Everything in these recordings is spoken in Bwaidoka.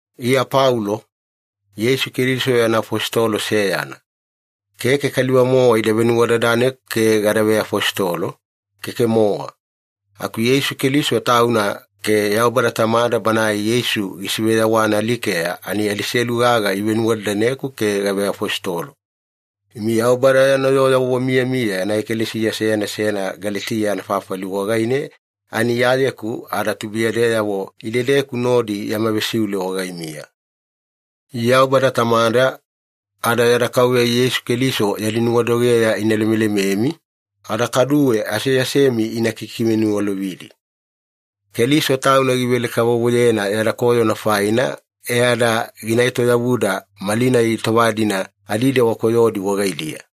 Iya Paulo, Yeisu Keliso yana afositolo seyana. Keke kaliva-mowa ida venuwadadaneku ke gada veafositolo, keke-mowa. Aku Yeisu Keliso Tauna ke Yaubada Tamada Banae Yeisu gisiveyawana alikeya ani adiselu gaga ivenuwadadaneku ke gaveafositolo. Imi Yaubada yana yoo wamiyamiya yana ekalesiya seyana seyana Galetiya anafafali wagaine ani Iyayeku ada tubuiyadeyavo idedeku nodi yama vesiule wagaimiya. Yaubada Tamada ada yada Kauveya Yeisu Keliso yadi nuwadogeya ina lemelememi, ada kaduwe aseasemi ina kikiveniwalovidi. Keliso Tauna givele-kavovoyena yada koyona faina, e ada gina etoyavuda malinai tova-dina adidewa koyodi wagaidiya.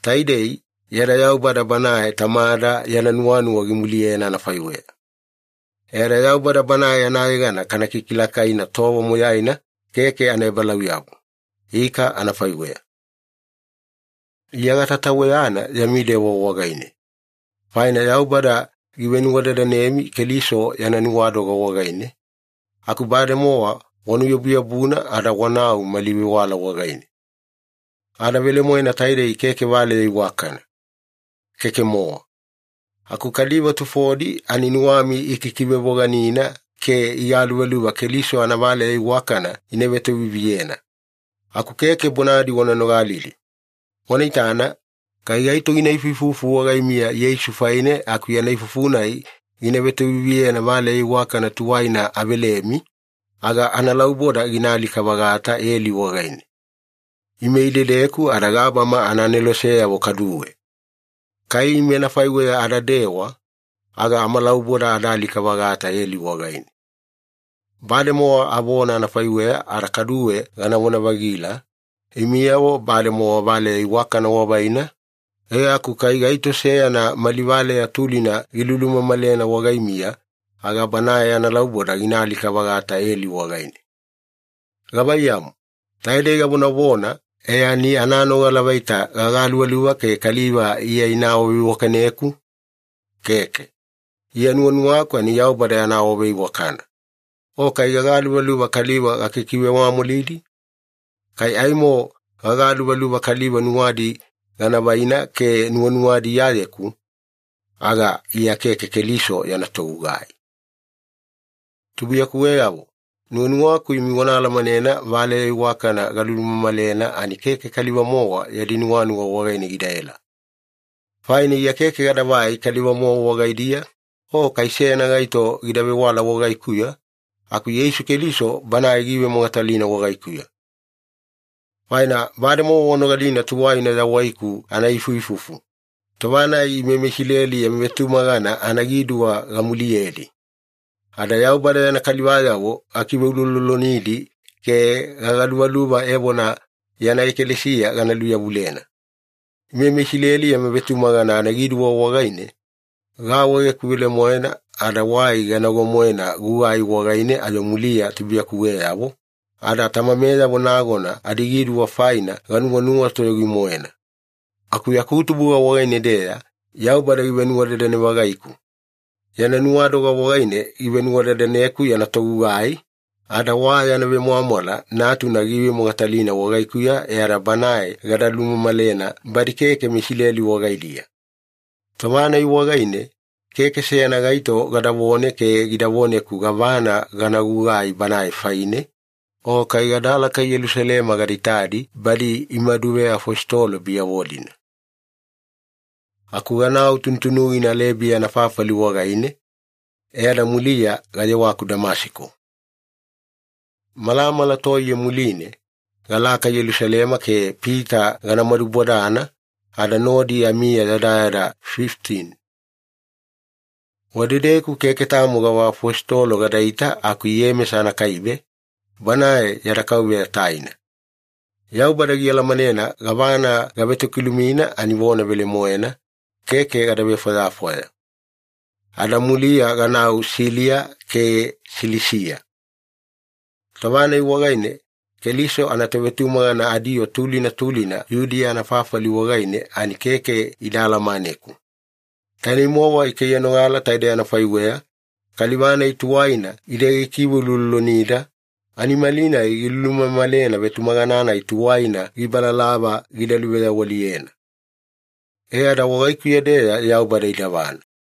Taidei, yada Yaubada Banae Tamada yana nuwanuwa gimuliyena anafaiweya. E ada Yaubada Banae anayegana kana kikilakaina tova moyaina keke anaebalauyabu. Ika anafaiweya. Iya gatataweyana yami dewa wagaine. Faina Yaubada givenuwadadanemi Keliso yana nuwadoga wagaine, aku bademowa wanuyabuyabuna ada wanau mali vewala wagaine. Ada velemoena taidei keke valeya iwakana. Keke-mowa. Aku kaliva tufodi ani nuwami ikikivevoganina ke igaluvaluva Keliso anavaleya iwakana ina vetoviviyena. Aku keke bonadi wana nogalidi. Wana itana, kai gaito gina ifuifufu wagaimiya Yeisu faine aku yana ifufu-nai gina vetoviviyena valeya iwakana tuwaina avelemi, aga analauboda gina alika-vagata eli wagaine. Ime idedeku ada gabama anaaneloseyavo kaduwe. Kai ime anafaiweya adadewa, aga amalauboda ada alika-vagata eli wagaine. Bademowa avona anafaiweya ada kaduwe ganavona-vagila, imiyavo bademowa valeya iwakana wavaina, e aku kai gaito seyana mali valeya tulina gilulumamalena wagaimiya, aga banae analauboda gina alika-vagata eli wagaine. Gavaiyamu, taidei gavonavona, e ani ananogala vaita gagaluvaluva ke kaliva Iya ina awaveiwakaneku? Keke. Iya nuwanuwaku ani Yaubada yana awaveiwakana. O kai gagaluvaluva kaliva gakikivemwamwalidi? Kai aimo gagaluvaluva kaliva nuwadi gana vaina ke nuwanuwadi Iyayeku, aga Iya keke Keliso yana togugai. Tubuiyakuweyavo, nuwanuwaku imi wana alamanena, valeya iwakana galumamalena ani keke kaliva-mowa yadi nuwanuwa wagaine gidaela. Faina Iya keke gadavai kaliva-mowa wagaidiya o kai seyana gaito gida vewala wagaikuya, aku Yeisu Keliso Banae giivemogatalina wagaikuya. Faina bademowa wanogalina tuwaina yawaiku anaifuifufu, tova-nai ime meIsileli yama vetumagana anagiduwa gamuliyedi. Ada Yaubada yana kalivayavo gakiveuloulolonidi ke gagaluvaluva evona yana ekalesiya gana luyavulena. Ime meIsileli yama vetumagana anagiduwa wagaine, gaawaegeku velemoena ada wai ganago-moena gugai wagaine ayo muliya tubuiyakuweyavo, ada tamameyavo nagona adigiduwa faina ganuwanuwa toyogi-moena. Aku yaku tubuga wagaine-deya Yaubada givenuwadadane-vagaiku. Yana nuwadoga wagaine givenuwadadaneku yana togugai, ada wa yana vemwamwala Natuna giivemogatalina wagaikuya e ada Banae gada lumamalena badi keke meIsileli wagaidiya. Tova-nai wagaine, keke seyana gaito gadavone ke gida voneku gavana gana gugai Banae faine, o kai gadalaka Yelusalema gada itadi badi imaduveafositolo biyavo-dina. Aku ganau tunutunugina Alebiya anafafali wagaine, e ada muliya gayewaku Damasiko. Malamala toiye muline, galaka Yelusalema ke Pita gana madubodana, ada nodi amiya yadayada fifitini. Wadedeku keke tamo gava afositolo gadaita aku Iyemesa anakaibe, banae yada Kauveya taina. Yaubada gialamanena gavana gavetokilumina ani vona velemoena, keke gada vefwayafwaya. Ada muliya ganau Siliya ke Silisiya. Tova-nai wagaine Keliso anatovetumagana adiyoo tulina tulina Yudiya anafafali wagaine ani keke ida alamaneku. Tainei-mowa ikaiyanogala taidei anafaiweya, “Kaliva-nai tuwaina ide gikiveuloulolonida, ani malinai gilulumamalena vetumagana-nai tuwaina gibalalava gida luveyawaliyena.” E ada wagaikuya-deya Yaubada idavana.